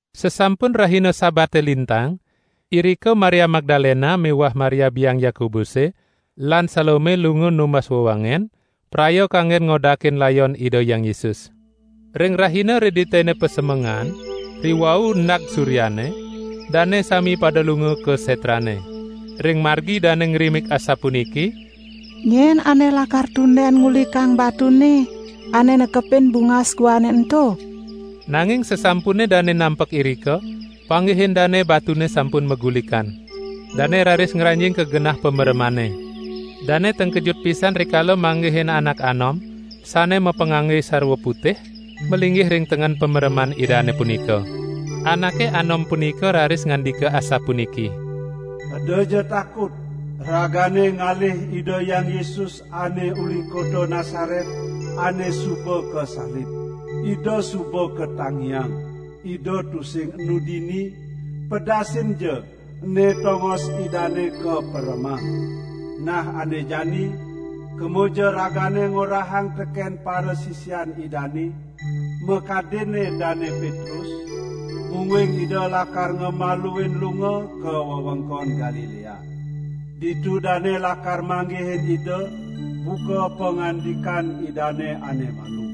Sasampun rahina Sabate lintang, irika Maria Magdalena miwah Maria biang Yakobuse lan Salome lunga numbas wewangen, praya kanggen ngodakin layon Ida Hyang Yesus. Ring rahina Reditene pasemengan, riwau endag suryane, dane sami pada lunga ka setrane. Ring margi dane ngrimik asapuniki: "Nyen ane lakar tunden ngulikang batune ane nekepin bungas guane ento?" Nanging sasampune dane nampek irika, panggihin dane batune sampun magulikan. Dane raris ngranjing ka genah pameremane. Dane tengkejut pisan rikala manggihin anak anom sane mapangangge sarwa putih, malinggih ring tengen pamereman Idane punika. Anake anom punika raris ngandika asapuniki: "Edaja takut! Ragane ngalih Ida Hyang Yesus ane uli kota Nasaret, ane suba kasalib! Ida suba katangiang, Ida tusing enu dini! Pedasinja, ene tongos Idane kaperemang! Nah ane jani, kemaja ragane ngorahang teken parasisian Idane, makadinne Dane Petrus, mungguing Ida lakar ngamaluin lunga ka wewengkon Galilea. Ditu dane lakar manggihin Ida buka pangandikan Idane ane malu."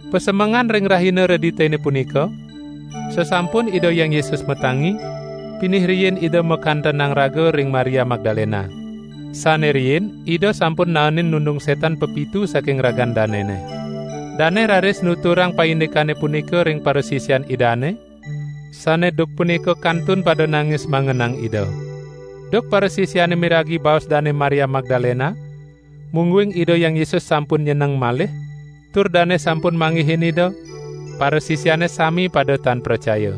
[Pasemengan ring rahina Reditene punika, sasampun Ida Hyang Yesus matangi, pinih riin Ida makantenang raga ring Maria Magdalena. Sane riin Ida sampun naenin nundung setan pepitu saking ragan danene. Dane raris nuturang paindikane punika ring parasisian Idane, sane duk punika kantun pada nangis mangenang Ida. Duk parasisiane miragi baos Dane Maria Magdalena, mungguing Ida Hyang Yesus sampun nyeneng malih, tur dane sampun manggihin Ida, parasisiane sami pada tan pracaya.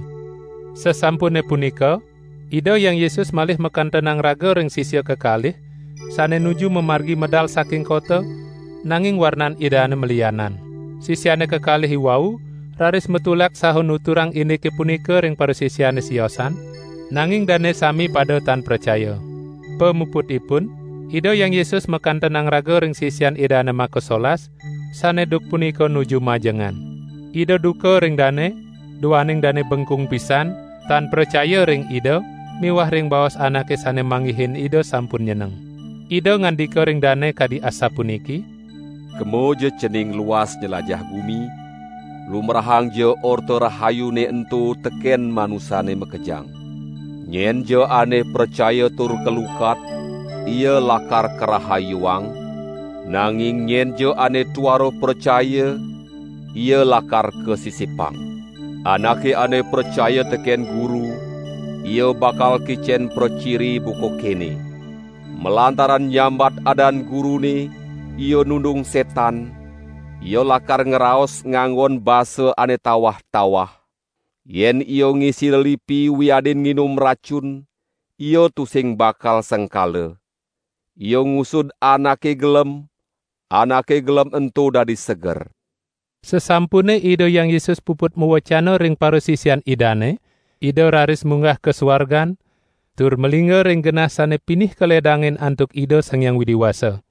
Sasampune punika, Ida Hyang Yesus malih makantenang raga ring sisia kekalih sane nuju mamargi medal saking kota, nanging warnan Idane malianan. Sisiane kekalih iwau raris matulak saha nuturang indike punika ring parasisiane siosan, nanging dane sami pada tan pracaya. Pamuputipun Ida Hyang Yesus makantenang raga ring sisian Idane makasolas, sane duk punika nuju majengan. Ida duka ring dane, duaning dane bengkung pisan, tan pracaya ring Ida miwah ring baos anake sane manggihin Ida sampun nyeneng. Ida ngandika ring dane kadi asapuniki: "Kemaja cening luas nylajah gumi, lumbrahangja Orta Rahayune ento teken manusane makejang! Nyenja ane pracaya tur kalukat ia lakar karahayuang, nanging nyenja ane tuara pracaya, ia lakar kasisipang. Anake ane pracaya teken Guru ia bakal kicen praciri buka kene: malantaran nyambat adan Gurune ia nundung setan, ia lakar ngraos nganggon basa ane tawah-tawah; yen ia ngisi lelipi wiadin nginum racun ia tusing bakal sengkala; ia ngusud anake gelem, anake gelem ento dadi seger." Sasampune Ida Hyang Yesus puput mawecana ring parasisian Idane, Ida raris munggah ka suargan tur malingga ring genah sane pinih kaledangin antuk Ida Sang Hyang Widi Wasa.